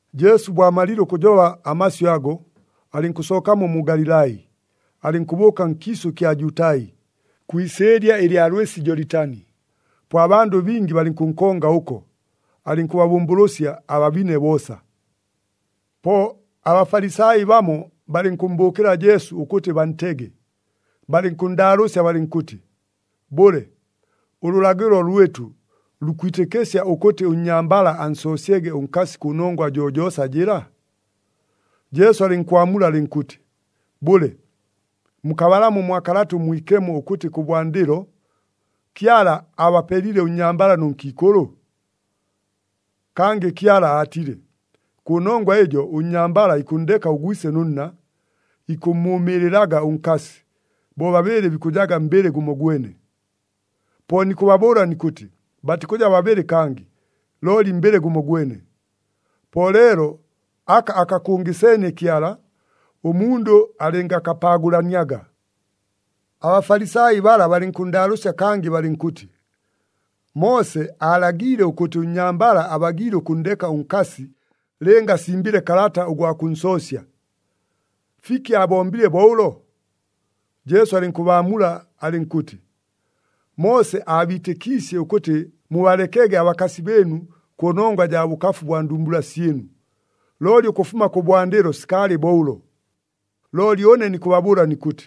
Jesu bo amalile ʉkʉjoba amasyʉ ago, alɨnkʉsookamo mu Galilai, alɨnkʉbʉʉka nkiisʉ kya Jutai, kwi isɨɨlya ɨlya lwɨsi Jolitani. Po abandʉ bingi balɨnkʉnkonga ʉko, alɨnkʉbabʉmbʉlʉsya ababine boosa. Po aBafalisai bamo balɨnkʉmmbʉʉkɨla Jesu ʉkʉtɨ bantege, balɨnkʉnndaalʉʉsya balɨnkʉtɨ, “Bʉle, ʉlʉlagɨlo lwɨtʉ lukwitɨkɨsya ʉkʉtɨ ʉnnyambala ansoosyege ʉnkasi kʉnongwa jojoosa jɨla?” Jesu alɨnkwamula alɨnkʉtɨ, “Bʉle, mukabalamo mwa Kalata ʉMwikemo ʉkʉtɨ kʉbwandɨlo, ‘Kyala aabapelile ʉnnyambala nʉ nkiikʉlʉ?’ Kangɨ Kyala aatile, ‘Kʉnongwa ɨjo ʉnnyambala ikʉnndeka ʉgwise nʉ nna, ikʉmmʉʉmɨɨlɨlaga ʉnkasi, bobabɨɨlɨ bikʉjaga mbɨlɨ gʉmogwene.’ Po nikʉbabʉʉla nikʉtɨ, batikʉja babɨlɨ kangɨ, looli mbɨlɨ gʉmogwene. Po leelo aka akakʉngɨseenie Kyala, ʉmundʉ alɨngakapaagʉlaniaga.” ABafalisai bala balɨnkʉnndaalʉʉsya kangɨ balɨnkʉtɨ, “Moose aalagiile ʉkʉtɨ ʉnnyambala abagiile ʉkʉnndeka ʉnkasi lɨnga asimbile kalata ʉgwa kʉnsoosya. Fiki aabombile bo ʉlo?” Jesu alɨnkʉbaamula alɨnkʉtɨ, “Moose aabiitɨkiisye ʉkʉtɨ mubalekege abakasi bɨɨnu kʉnongwa jaa bʉkafu bwa ndumbula syɨnu, looli ʉkʉfuma kʉbwandɨlo sikaalɨ bo ʉlo. Looli ʉne nikʉbabʉʉla nikʉtɨ,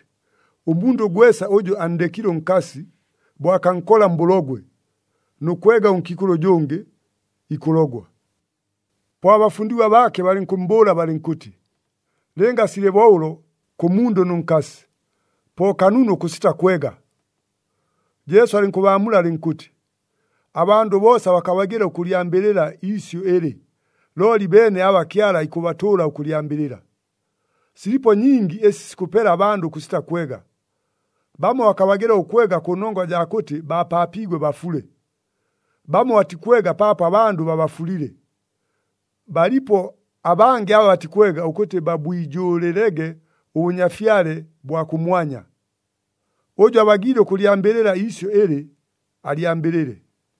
ʉmundʉ gwesa ʉjʉ anndekile ʉnkasi, bo akankola mbʉlogwe, nʉ kwega ʉnkiikʉlʉ ʉjʉngɨ, ikʉlogwa.” Po abafundigwa baake balɨnkʉmmbʉʉla balɨnkʉtɨ, “Lɨnga silɨ bo ʉlo kʉ mundʉ nʉ nkasi, po kanunu ʉkʉsita kwega!” Jesu alɨnkʉbaamula alɨnkʉtɨ, “Abandʉ boosa bakabagɨla ʉkʉlyambɨlɨla iisyʉ ɨlɨ, looli beene aba Kyala ikʉbatʉʉla ʉkʉlyambɨlɨla. Silipo nyingi ɨsi sikʉpela abandʉ ʉkʉsita kwega. Bamo bakabagɨla ʉkwega kʉnongwa jaa kʉtɨ baapaapiigwe bafule. Bamo batikwega paapo abandʉ babafulile. Balipo abangɨ aba batikwega ʉkʉtɨ babwijʉʉlɨlege ʉBʉnyafyale bwa kʉmwanya. Ʉjʉ abagiile ʉkʉlyambɨlɨla iisyʉ ɨlɨ, alyambɨlɨle.”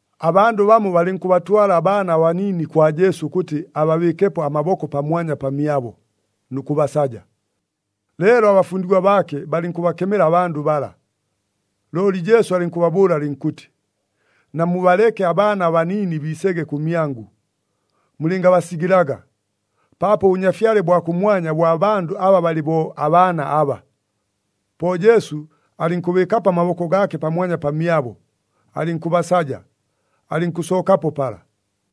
Abandʉ bamo balɨnkʉbatwala abaana abaniini kwa Jesu ʉkʉtɨ ababɨɨkepo amaboko pamwanya pamyabo, nʉ kʉbasaja. Leelo abafundigwa baake balɨnkʉbakemela abandʉ bala. Looli Jesu alɨnkʉbabʉʉla alɨnkʉtɨ, “Namubaleke abaana abaniini biisege kʉmyangʉ, mulɨngabasigɨlaga, paapo ʉBʉnyafyale bwa kʉmwanya bwa bandʉ aba balɨ bo abaana aba.” Po Jesu alɨnkʉbɨɨkapo amaboko gaake pamwanya pamyabo, alɨnkʉbasaja, alɨnkʉsookapo pala.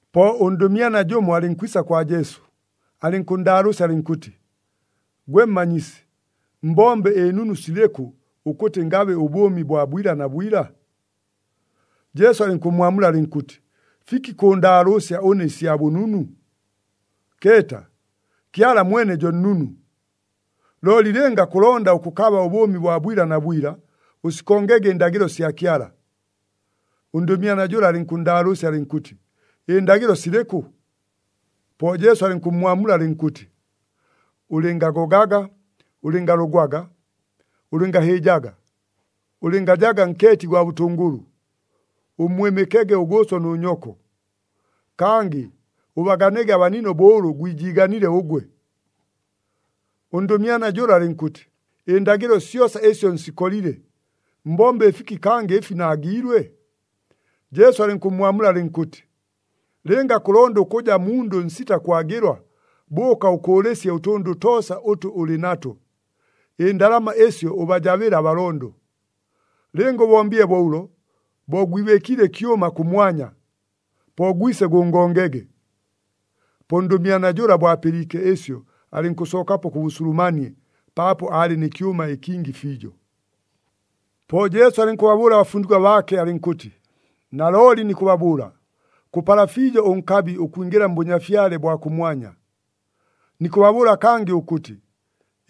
Po ʉndʉmyana jʉmo alɨnkwisa kwa Jesu, alɨnkʉnndaalʉʉsya alɨnkʉtɨ, “Gwe Mmanyisi, mbombe ɨnunu silɨkʉ ʉkʉtɨ ngabe ʉbʉʉmi bwa bwila na bwila?” Jesu alɨnkʉmmwamula alɨnkʉtɨ, “Fiki kʉʉndaalʉʉsya ʉne ɨsya bʉnunu? Keeta, Kyala mwene jo nnunu! Looli lɨnga kʉlonda ʉkʉkaba ʉbʉʉmi bwa bwila na bwila, ʉsikongege ɨndagɨlo sya Kyala.” Ʉndʉmyana jʉla alɨnkʉnndaalʉʉsya alɨnkʉtɨ, “Ɨndagɨlo silɨkʉ?” Po Jesu alɨnkʉmmwamula alɨnkʉtɨ, “Ʉlɨngagogaga, ʉlɨngalogwaga, ʉlɨngahɨɨjaga, ʉlɨngajaga nkeeti gwa bʉtʉngʉlʉ, ʉmmwɨmɨkege ʉgʉʉso nʉ nyoko,” kangɨ, “Ʉbaganege abanino bo ʉlʉ gwijiiganile ʉgwe.” Ʉndʉmyana jʉla alɨnkʉtɨ, “Ɨndagɨlo syosa ɨsyo nsikolile. Mbombe ɨfiki kangɨ ɨfi naagiilwe?” Jesu alɨnkʉmmwamula alɨnkʉtɨ, “Lɨnga kʉlonda ʉkʉja mundʉ ʉnsita kwagɨlwa, bʉʉka ʉkʉʉlɨsye ʉtʉndʉ toosa ʉtʉ ʉlɨ nato, ɨndalama ɨsyo ʉbajabɨle abalondo. Lɨnga ʉbombile bo ʉlo, bo gwibɨɨkiile ɨkyʉma kʉmwanya. Po gwise gʉngongege.” Po ʉndʉmyana jʉla bo apɨliike ɨsyo, alɨnkʉsookapo kʉ bʉsulumanie paapo aalɨ nɨ kyʉma ɨkingi fiijo. Po Jesu alɨnkʉbabʉʉla abafundigwa baake alɨnkʉtɨ, “Nalooli nikʉbabʉʉla, kʉpala fiijo ʉnkabi ʉkwingɨla mBʉnyafyale bwa kʉmwanya. Nikʉbabʉʉla kangɨ ʉkʉtɨ,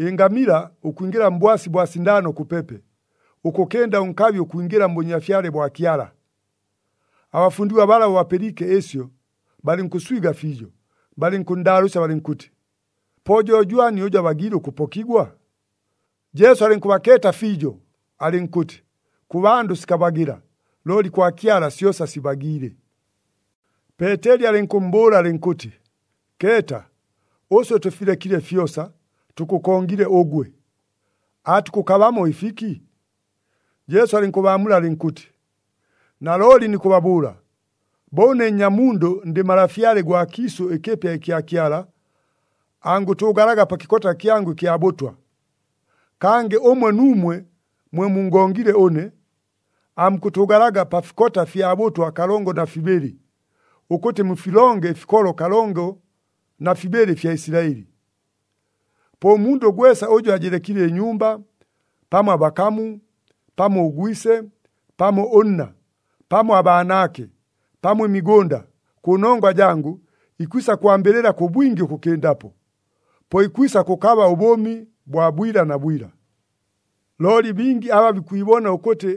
ɨngamila ʉkwingɨla mbwasi bwa sindaano kʉpepe, ʉkʉkɨnda ʉnkabi ʉkwingɨla mBʉnyafyale bwa Kyala!” Abafundigwa bala bo bapɨliike ɨsyo, balɨnkʉswiga fiijo, balɨnkʉnndaalʉʉsya balɨnkʉtɨ, “Po jo jwani ʉjʉ abagiile ʉkʉpokigwa?” Jesu alɨnkʉbakeeta fiijo, alɨnkʉtɨ, “Kʉ bandʉ sikabagɨla, looli kwa Kyala syosa sibagiile.” Peeteli alɨnkʉmmbʉʉla alɨnkʉtɨ, “Keeta, ʉswe tʉfilekile fyosa, tʉkʉkongile ʉgwe! Aatukʉkabamo ɨfiki?” Jesu alɨnkʉbaamula alɨnkʉtɨ, “Nalooli nikʉbabʉʉla, bo ʉne Nnyamundʉ ndɨ Malafyale gwa kiisʉ ɨkɨpya ɨkya Kyala, angʉtʉʉgalaga pa kɨkota kyangʉ ɨkya bʉtwa. Kangɨ ʉmwe nuumwe mwe mungongile ʉne, aamukʉtʉʉgalaga pa fikota fya bʉtwa kalongo na fibɨlɨ, ʉkʉtɨ mufilonge ɨfikolo kalongo na fibɨlɨ ɨfya Isilaɨli. Po ʉmundʉ gwesa ʉjʉ ajɨlekile ɨnyumba, pamo abakamu, pamo ʉgwise, pamo ʉnna, pamo abaanaake, pamo ɨmigʉnda, kʉnongwa jangʉ, ikwisa kwambɨlɨla kʉ bwingi ʉkʉkɨndapo. Po ikwisa kʉkaba ʉbʉʉmi bwa bwila na bwila. “Looli bingi aba bikwibona ʉkʉtɨ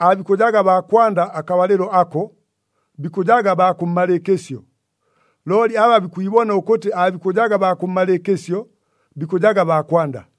aabikʉjaga baa kwanda akabalɨlo ako, bikʉjaga baa kʉmmalɨɨkɨsyo. Looli aba bikwibona ʉkʉtɨ aabikʉjaga baa kʉmmalɨɨkɨsyo, bikʉjaga baa kwanda.”